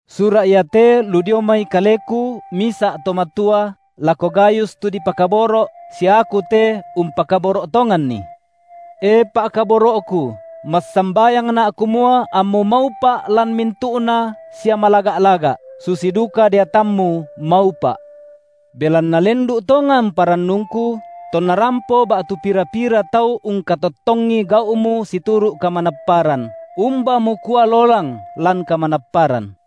Sura’ iate lu dio mai kaleku, misa’ to matua, lako Gayus tu dipakaboro’ sia aku te umpakaboro’ tonganni. E pa’kaboro’ku, massambayangna’ kumua ammu maupa’ lan mintu’na sia malaga’-laga’, susi duka deatammu maupa’. Belanna lendu’ tongan parannungku, tonna rampo ba’tu pira-pira tau ungkatottongi gau’mu situru’ kamanapparan, umba mukua lolang lan kamanapparan.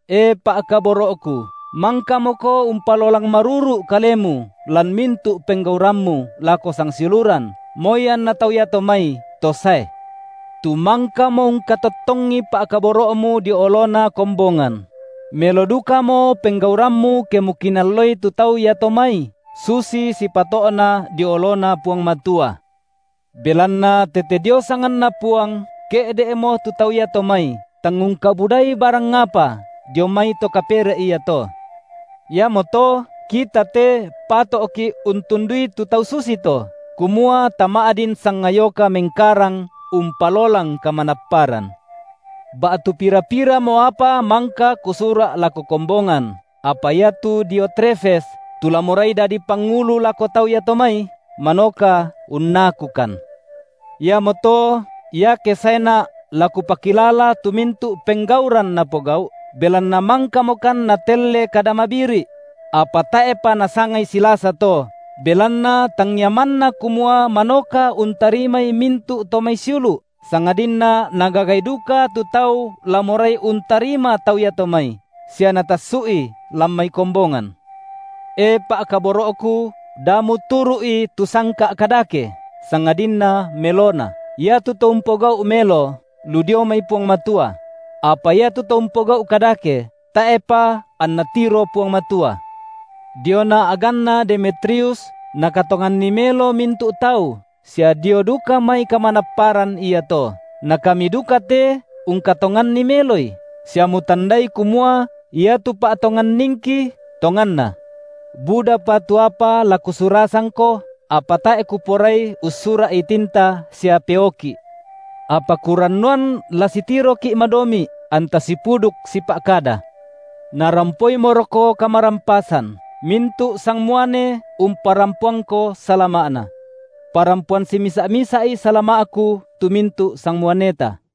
E pa’kaboro’ku, mangkamoko umpalolang maruru’ kalemu lan mintu’ penggaurammu lako sangsiuluran, moi anna tau iato mai to sae. Tu mangkamo ungkatottongi pa’kaboro’mu dio olona kombongan; melo dukamo penggaurammu ke mukinalloi tu tau iato mai, susi sipato’na dio oloNa Puang Matua. Belanna tete dio sanganNa Puang ke’de’mo tu tau iato mai, tang ungkabudai barang apa dio mai to kapere’ iato. Iamoto kita te pato’ki’ untundui tu tau susito, kumua tama’din sangayoka mengkarang umpalolang kamanapparan. Ba’tu pira-piramo apa mangka kusura’ lako kombongan, apa iatu Diotrefes tu la morai dadi pangulu lako tau iato mai, manoka unnakukan. Iamoto iake saena’ la kupakilala tu mintu’ penggauran napogau’, belanna mangkamokan natelle kada mabiri’; apa tae’pa nasangai silasa to, belanna tangia manna kumua manoka untarimai mintu’ to mai siulu’, sangadinna nagagai duka tu tau la morai untarima tau iato mai, sia natassu’i lan mai kombongan. E pa’kaboro’ku da muturu’i tu sangka’ kadake, sangadinna melona. Iatu to umpogau’ melo, lu dio mai Puang Matua; apa iatu to umpogau’ kadake, tae’pa anna tiro Puang Matua. Diona a’ganna Demetrius nakatonganni melo mintu’ tau sia dio duka mai kamanapparan iato; na kami duka te ungkatonganni meloi, sia mutandai kumua iatu pa’tonganningki tonganna. Budapa tu apa la kusurasangko, apa tae’ kuporai ussura’i tinta sia peoki’. Apa kurannuan la sitiroki’ madomi’ anta sipuduk sipa’kada. Narampoimoroko kamarampasan. Mintu’ sangmuane umparampoangko salama’na. Parampoan simisa’-misa’i salama’ku tu mintu’ sangmuaneta.